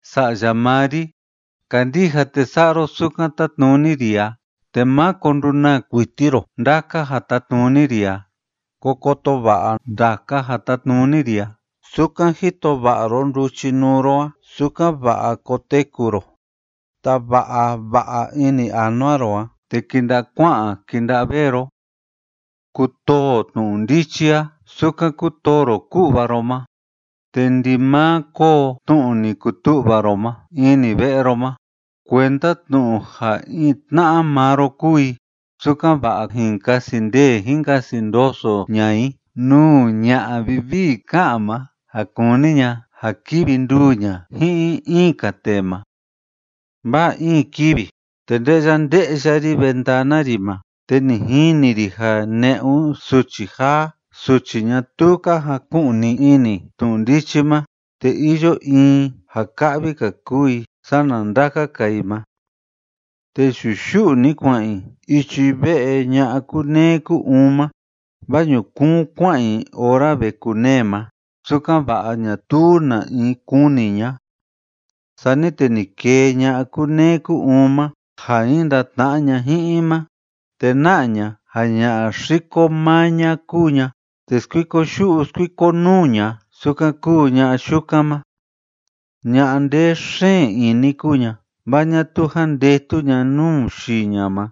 Sa'ya maa ri, kandija te sa'a ro sukan tátnuni ri a, te máko ndunaa kuiti ro ndaka ja tátnuni ri a. Ko koto va'a ndaka ja tátnuni ri a sukan jito va'a ro nduchinuu ro a, sukan‑va'a koteku ro. Tava'a va'a ini anua ro a, te kinda'a kua'an kinda'a vee ro. Kutoo tnu'u ndichi a sukan kútoo ro ku'va ro ma, te ndimaa kóo tnu'u ni kutu'va ro ma ini ve'e ro ma, kuenda tnu'u ja in tna'a maa ro kuu i, sukan‑va'a jin kasi ndee jin kasi ndoso ña'a i nuu ña'a vivii ká'an ma ja kúni ña ja kivi nduu ña ji'in in‑ka tee ma. Vaa in kivi te nde'ya nde'ya ri ventana ri ma, te ni jini ri ja ne'un suchi jaa suchi ñatuu ka jaku'ni ini tnu'u ndichi ma, te iyo in i ja ka'vi‑ka kuu i sana ndaka‑ka i ma, te yu'u yu'u‑ni kua'an i ichi ve'e ña'a kúneé kú‑uun ma, vaa ñukuun kua'an i ora ve kunee ma, sukan‑va'a ñatuu na‑in kuni ña'a. Sani te ni kee ña'a kúneé kú‑uun ma ja jin ndatna'a ña ji'in i ma, te na'a ña ja ña'a xiko maa ña kúu ña, te skuiko yu'u skuiko nuu ña sukan kúu ña'a yukan ma. Ña'a ndee xeen ini kúu ña, vaa ñatuu jandetu ña nuu yii ña ma,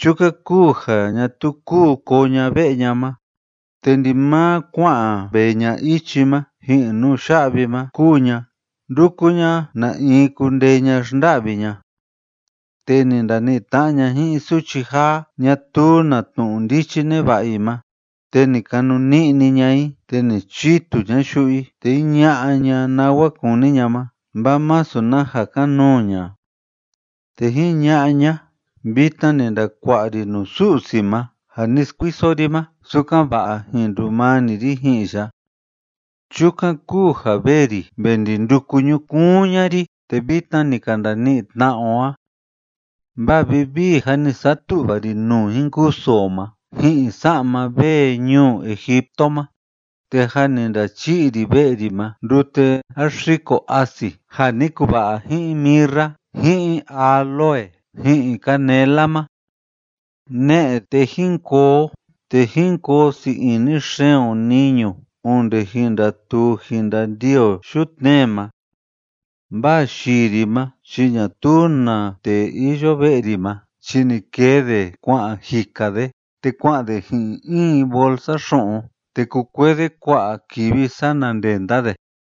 chukan kúu ja ñatuu kúu koo ña ve'e ña ma, te ndimaa kua'an vee ña ichi ma ji'in nuya'vi ma kúu ña nduku ña na in kundee ña xnda'vi ña. Te ni ndani'i tna'a ña ji'in suchi jaa ñatuu na tnu'u ndichi neva'a i ma, te ni kanuni'ni ña i te ni chitu ña yu'u i, te jiña'a ña nawa kúni ña ma, vaa masu na ja kan‑nuu ña. Te jiña'a ña: “Vitna ni ndakua'a ri nuu Su'si ma ja ni skuiso ri ma, sukan‑va'a jin ndumani ri ji'in ya. Chukan kúu ja vee ri ve ndi nduku ñukuun ña'a ri, te vitna ni ka ndani'i tna'a o a. Vaa vivii jâ ni satu'va ri nuu jin kusu o ma ji'in sa'ma vee ñuu Egipto ma, te jâ ni ndachi'i ri ve'e ri ma ndute jáxiko asi ja ni kuva'a ji'in mirra ji'in áloe ji'in canela ma. Ne'e, te jín koo o te jín koo sii ini xeen o niñu onde jin ndatuu jin ndandii o yutnee ma. Vaa yii ri ma chi ñatuu na tee iyo ve'e ri ma chi ni kee de kua'an jika de, te kua'an de ji'in in bolsa xu'un, te kukuee de kua'a kivi sana ndenda de”,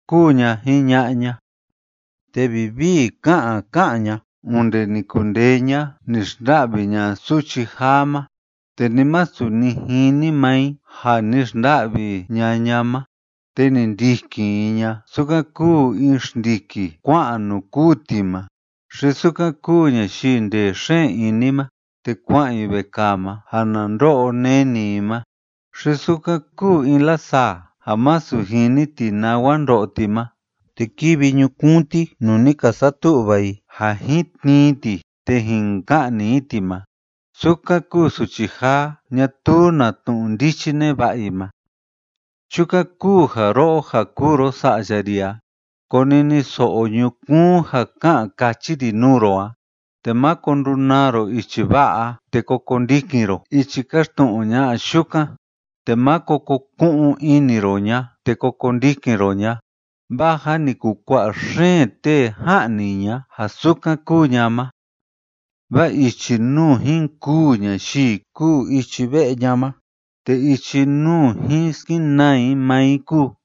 kúu ña jiña'a ña. Te vivii ká'an ká'an ña onde ni kundee ña ni xnda'vi ña suchi jaa ma, te ni masu ni jini maa i ja ni xnda'vi ña'a ña ma, te ni ndikin i ña sukan kúu in xndiki kua'an nuu kûu ti ma, xi sukan kúu ñayii ndee xeen ini ma te kua'an i vekaa ma ja na ndo'o neni i ma, xi sukan kúu in lasaa ja masu jini ti nawa ndo'o ti ma, te kivi ñukuun ti nuu ni ka satu'va i ja jin tnii i ti te jin ka'ni i ti ma, sukan kúu suchi jaa ñatuu na tnu'u ndichi neva'a i ma. Chukan kúu ja ro'o ja kúu ro sa'ya ri a, koniniso'o ñukuun ja ká'an káchi ri nuu ro a, te máko ndunaa ro ichi va'a a te ko kondikin ro ichi kaxtnu'u ña'a yukan, te máko ko ku'un ini ro ña te ko kondikin ro ña, vaa jâ ni kukua'a xeen tee ja'ni ña ja sukan kúu ña ma. Vaa ichi nuu jin kûu ñayii kúu ichi ve'e ña ma, te ichi nuu jin skenaa i maa i kúu.